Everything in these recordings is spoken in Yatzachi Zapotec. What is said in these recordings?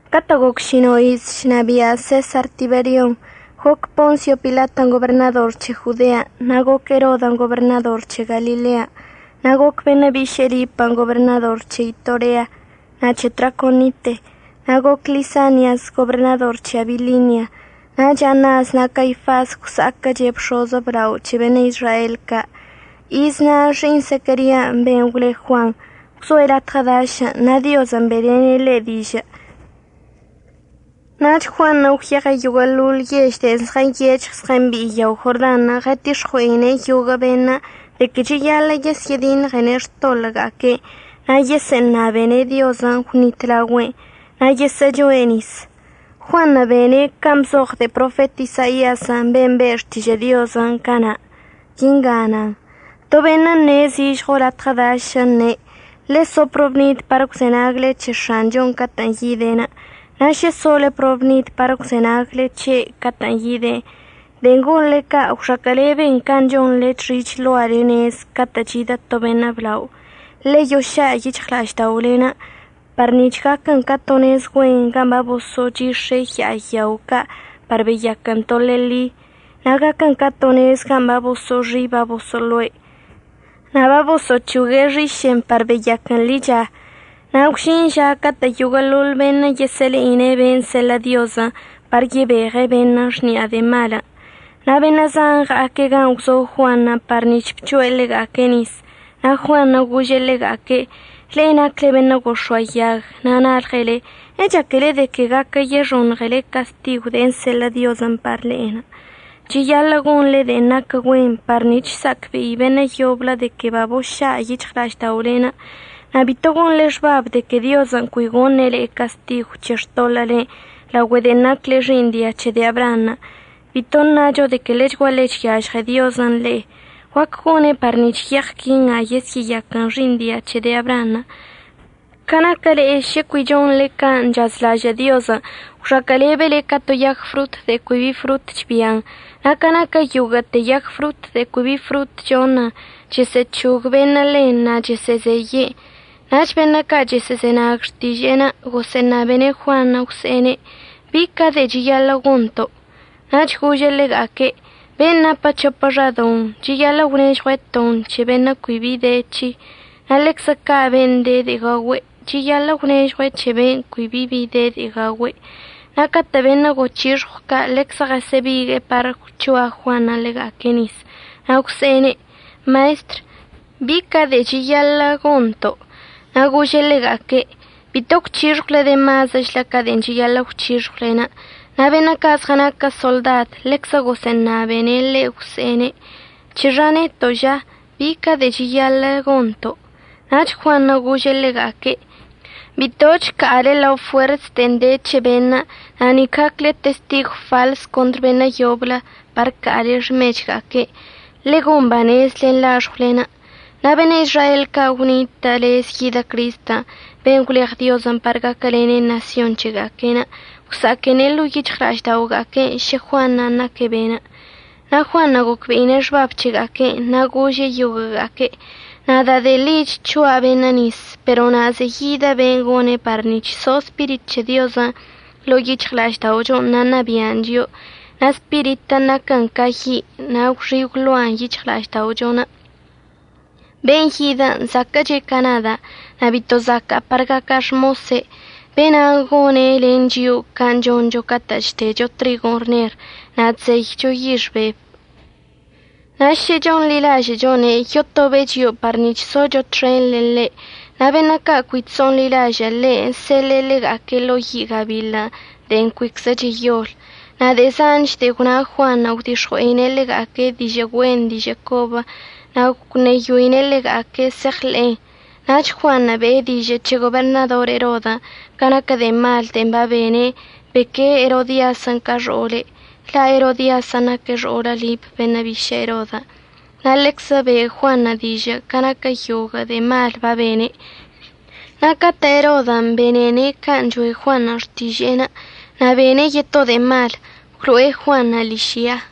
Catə' goc šino' iz chnabia' Sesar Tiberion', goc Ponsio Pilatən' goberṉador c̱he Jodean'. Na' goc Erodən' goberṉador c̱he Galilean', na' goc beṉə' biše'e Lipən' goberṉador c̱he Itorea na' c̱he Traconite. Na' goc Lisanias goberṉador c̱he Abilinia. Nach Anas na' Caifas gwsa'aquəche' bx̱oz əblao c̱he beṉə' Izrael ca'. Iz na' xi'iṉ Zequerian', ben' gwle Juan, gwzoe' latɉə dašən' na' Diozən' be'elene' ḻe' dižə'. Nach Juanṉə' gwyeɉe' yoguə'əḻoḻ yež de'e zɉənyec̱hɉ zɉəmbi'i yao Jordanṉə', ɉətix̱ɉue'ine' yoguə' beṉə' de que cheyaḻə' yesyə'ədiṉɉene' xtoḻə'əga'aque'enə' na' yesə'əṉabene' Diozən' əgwṉitlaogüe'en, na' yesə'əchoe' nis. Juanṉə' bene' can' bzoɉ de'e profet Isaiazən' ben' be' xtižə' Diozən' cana'. Quinga nan: To beṉə' əṉe' zižɉo latɉə dašən', əṉe': “Ḻe'e so probnid par əgwzenagle c̱he X̱anchon' catə'ən yide'. Na' šə sole probnid par əgwzenagle c̱he' catə'ən yide', de'en gonḻe ca' gwxaquə'əleben can' chonḻe chxi' chloale nez ca' catə' chidə to beṉə' blao. Ḻe'e yoša' yic̱hɉla'ažda'olen' par nic̱h gaquən ca to nez güen gan' baboso'ochix̱e' ya'a yao ca' par beyaquən to leḻi. Na' gaquən ca to nez gan' baboso'oxi' baboso'oloe', na' bagosə'əc̱hogue' xiše'en par beyaquən ḻicha. Na' gwžin ža catə' yoguə'əḻoḻ beṉə' yesə'əle'ine' ben' seḻə' Diozən' par yebeɉe' beṉə' xni'a de'e malən'.” Na' beṉə' zan ɉa'aque' gan' gwzo Juanṉə' par nic̱h bc̱hoe' ḻega'aque' nisən'. Na' Juanṉə' gože' ḻega'aque': ―Le'e nacle beṉə' gox̱oayag na' nalɉele. ¿Echaquele de que guaquə yexoṉɉele castigon' de'en əseḻə' Diozən' par le'e? Cheyaḻə' gonḻe de'en naquə güen par nic̱h sa'acbe'i beṉə' yoblə de que baboša' yic̱hɉla'ažda'olen'. Na' bito gonḻe xbab de que Diozən' cui gone' le'e castigw c̱he xtoḻə'əlen' laogüe de'en nacle xi'iṉ dia c̱he de'e Abraanṉə'. Bito ṉacho de que ḻechguaḻe chyažɉe Diozən' le'e. Guaquə gone' par nic̱h yeɉ quinga yesyə'əyaquən xi'iṉ dia c̱he de'e Abraanṉə'. Ca naquə le'e šə cui chonḻe can' chazlažə' Diozən', gwxaquə'əlebele ca to yag frot de'e cui bi frot chbian'. Na' ca naquə yoguə'əte yag frot de'e cui bi frot choṉ, chəsə'əc̱hog beṉə' ḻen na' chəsə'əzeye'en. Nach beṉə' ca' chəsə'əzenag xtiže'enə' gosə'əṉabene' Juanṉə' gwse'ene': ―¿Bi ca de'e cheyaḻə' gonto'? Nach gože' ḻega'aque': ―Ben' napə c̱hopə xadoṉ, cheyaḻə' əgwnežɉue' ton c̱he beṉə' cui bi bi de c̱he'. Na' ḻeczə ca' ben' de de'e gaogüe', cheyaḻə' əgwnežɉue' c̱he beṉə' cui bi bi de de'e gaogüe'. Na' catə' beṉə' goc̱hixɉw ca' ḻeczə ɉəsə'əbigue'e par gwc̱hoa Juanṉə' ḻega'aque' nis na' gwse'ene': ―Maestr; ¿bi ca de'e cheyaḻə'əch gonto'? Na' gože' ḻega'aque': ―Bito əgwc̱hixɉwle de mazəchlə ca de'en cheyaḻə' əgwc̱hixɉwle. Na' beṉə' ca' zɉənaque' soḻdad ḻeczə gosə'əṉabene' ḻe' gwse'ene': ―¿C̱hexa neto' ža? ¿Bi ca de'e cheyaḻə'əch gonto'? Nach Juanṉə' gože' ḻega'aque': ―Bitoch əca'ale ḻa fuers de'en de c̱he beṉə', na' nic gacle testigw faḻs contr beṉə' yoblə par əca'ale xmechga'aque'. Ḻe'e gon banez len laxɉwlen'. Na' beṉə' Izrael ca' gwnitə' lez yidə Cristən' ben' gwleɉ Diozən' par gaquəlene' ṉasyon c̱hega'aque'enə', gwsa'aquene' ḻo'o yic̱hɉla'až daoga'aque' šə Juanṉə' naque' be'enə'. Na' Juanṉə' gocbe'ine' xbab c̱hega'aque'enə' na' gože' yoguə'əga'aque': ―Nada' de'e ḻi chc̱hoacza' beṉə' nis, pero na' ze'e yidə ben' gone' par nic̱h so Spirit c̱he Diozən' ḻo'o yic̱hɉla'ažda'ochon' na' ṉabi'an chio'o. Na' Spiritən' naquən ca yi' na' gwxi' gwloan yic̱hɉla'ažda'ochon'. Ben' yidə zaquə'əche' ca nada' na' bito zaca'a par gaca' xmose'. Be'enan' gone' len chio'o can' choncho catə' chdecho trigon' rṉer na' chzeycho yix bebən'. Na' šə chonḻilažə'əchone' yotobe' chio'o par nic̱h socho txen len ḻe', na' beṉə' ca' cui chso'onḻilažə' ḻe' əseḻe'e ḻega'aque' lao yi' gabiḻən' de'en cuiczə cheyol. Na' de'e zanch de'e gwna Juanṉə' gwdix̱ɉue'ine' ḻega'aque' dižə' güen dižə' cobən' na' gwṉeyoine' ḻega'aque' se'eɉḻe'en. Nach Juanṉə' be'e dižə' c̱he goberṉador Erodən' ca naquə de'e mal de'en babene'enə' beque'e Erodiasən' ca xo'ole'. La' Erodiasən' naque' xo'olə Lip beṉə' bišə' Erodən'. Na' ḻeczə be'e Juanṉə' dižə' ca naquə yoguə' de'e malən' babene'. Na' catə' Erodən' benene' can' choe' Juanṉə' xtiže'enə' na' bene' yeto' de'e mal, gwlo'e Juanṉə' ližya.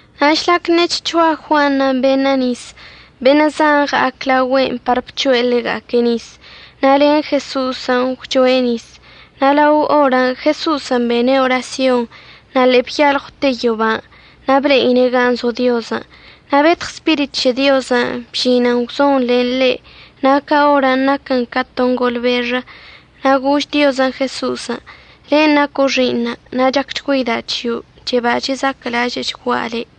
Na' žlac ṉe'e chc̱hoa Juanṉə' beṉə' nis, beṉə' zan ɉa'ac laogüe'enə' par bc̱hoe' ḻega'aque' nisən' na' len Jeso'osən' gwchoe' nisən'. Na' lao orən' Jeso'osən' bene' orasyon na' ḻe'e byalɉwte yoban' na' ble'ine' gan' zo Diozən'. Na' betɉ Spirit c̱he Diozən' bžinən gwzon len ḻe' na' ca orən' naquən ca to ngolbexə. Na' gož Diozən' Jeso'osən': ―Le' naco' Xi'iṉa', na' chacchgüeida' c̱hio'. Cheba chezaquə'əlažə'əchgua' le'.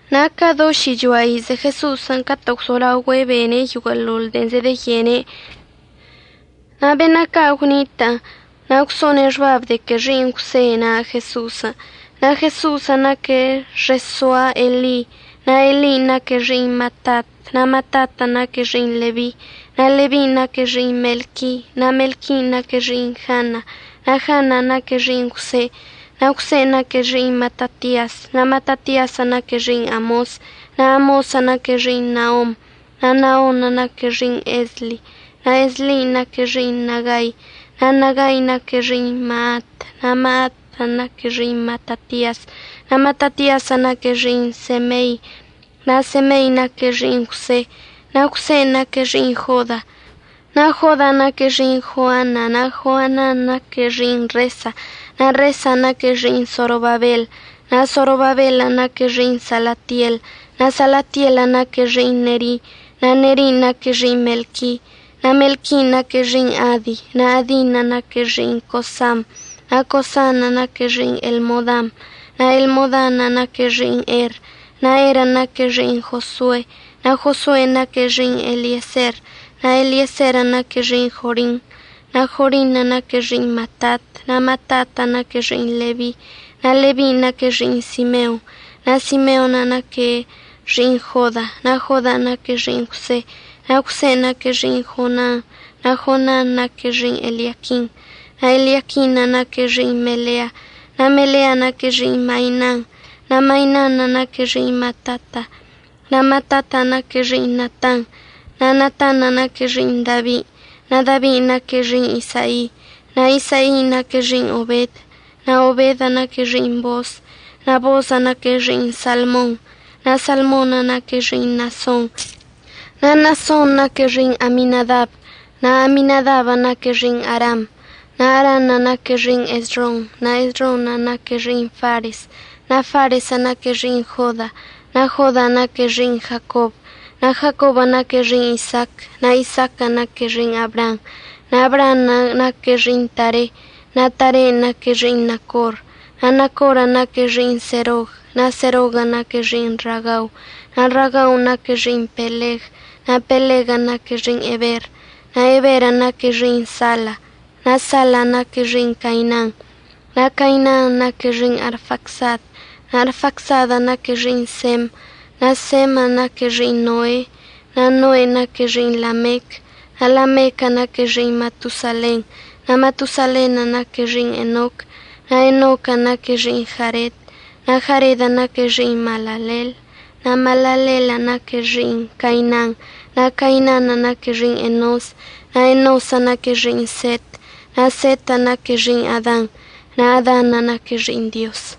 Na' ca do šichoa ize Jeso'osən' catə' gwzolaogüe' bene' yoguə'əḻoḻ de'en zedeyene'. Na' beṉə' ca' gwnitə' na' gwso'one' xbab de que xi'iṉ Jwse na' Jeso'osən'. Na' Jeso'osən' naque' xesoa Eli. Na' Elin' naque' xi'iṉ Matat, na' Matatən' naque' xi'iṉ Lebi, na' Lebin' naque' xi'iṉ Melqui, na' Melquin' naque' xi'iṉ Jana, na' Janan' naque' xi'iṉ Jwse. Na' Jwsen' naque' xi'iṉ Matatias, na' Matatiasən' naque' xi'iṉ Amos, na' Amosən' naque' xi'iṉ Naom, na' Naonṉə' naque' xi'iṉ Esli. Na' Eslin' naque' xi'iṉ Nagai, na' Nagain' naque' xi'iṉ Maat, na' Maatən' naque' xi'iṉ Matatias, na' Matatiasən' naque' xi'iṉ Semei, na' Semein' naque' xi'iṉ Jwse, na' Jwsen' naque' xi'iṉ Joda. Na' Jodan' naque' xi'iṉ Joana, na' Joanan' naque' xi'iṉ Resa, na' Resan' naque' xi'iṉ Sorobabel, na' Sorobabelən' naque' xi'iṉ Salatiel. Na' Salatielən' naque' xi'iṉ Neri, na' Nerin' naque' xi'iṉ Melqui, na' Melquin' naque' xi'iṉ Adi, na' Adin' naque' xi'iṉ Cosam, na' Cosanṉə' naque' xi'iṉ Elmodam, na' Elmodanṉə' naque' xi'iṉ Er. Na' Erən' naque' xi'iṉ Josue, na' Josuen' naque' xi'iṉ Elieser, na' Elieserən' naque' xi'iṉ Jorim, na' Jorinṉə' naque' xi'iṉ Matat. Na' Matatən' naque' xi'iṉ Lebi, na' Lebin' naque' xi'iṉ Simeon, na' Simeonṉə' naque' xi'iṉ Joda, na' Jodan' naque' xi'iṉ Jwse, na' Jwsen' naque' xi'iṉ Jonan, na' Jonanṉə' naque' xi'iṉ Eliaquim. Na' Eliaquinṉə' naque' xi'iṉ Melea, na' Melean' naque' xi'iṉ Mainan, na' Mainanṉə' naque' xi'iṉ Matata, na' Matatan' naque' xi'iṉ Natan. Na' Natanṉə' naque' xi'iṉ Dabi, na' Dabin' naque' xi'iṉ Isai, na' Isain' naque' xi'iṉ Obed, na' Obedən' naque' xi'iṉ Boos, na' Boosən' naque' xi'iṉ Salmon, na' Salmonṉə' naque' xi'iṉ Naason. Na' Naasonṉə' naque' xi'iṉ Aminadab, na' Aminadabən' naque' xi'iṉ Aram, na' Aranṉə' naque' xi'iṉ Esrom, na' Esronṉə' naque' xi'iṉ Fares. Na' Faresən' naque' xi'iṉ Joda, na' Jodan' naque' xi'iṉ Jacob, na' Jacobən' naque' xi'iṉ Isaac, na' Isaaquən' naque' xi'iṉ Abraam, na' Abraanṉə' naque' xi'iṉ Tare, na' Taren' naque' xi'iṉ Nacor. Na' Nacorən' naque' xi'iṉ Serog, na' Seroguən' naque' xi'iṉ Ragau, na' Ragaun' naque' xi'iṉ Peleg, na' Peleguən' naque' xi'iṉ Eber. Na' Eberən' naque' xi'iṉ Sala, na' Salan' naque' xi'iṉ Cainan, na' Cainanṉə' naque' xi'iṉ Arfacsad, na' Arfacsadən' naque' xi'iṉ Sem, na' Senṉə' naque' xi'iṉ Noe, na' Noen' naque' xi'iṉ Lamec. Na' Lamequən' naque' xi'iṉ Matosalen, na' Matosalenṉə' naque' xi'iṉ Enoc, na' Enoquən' naque' xi'iṉ Jared, na' Jaredən' naque' xi'iṉ Maalaleel. Na' Maalaleelən' naque' xi'iṉ Cainan, na' Cainanṉə' naque' xi'iṉ Enos, na' Enosən' naque' xi'iṉ Set, na' Setən' naque' xi'iṉ Adan, na' Adanṉə' naque' xi'iṉ Dioz.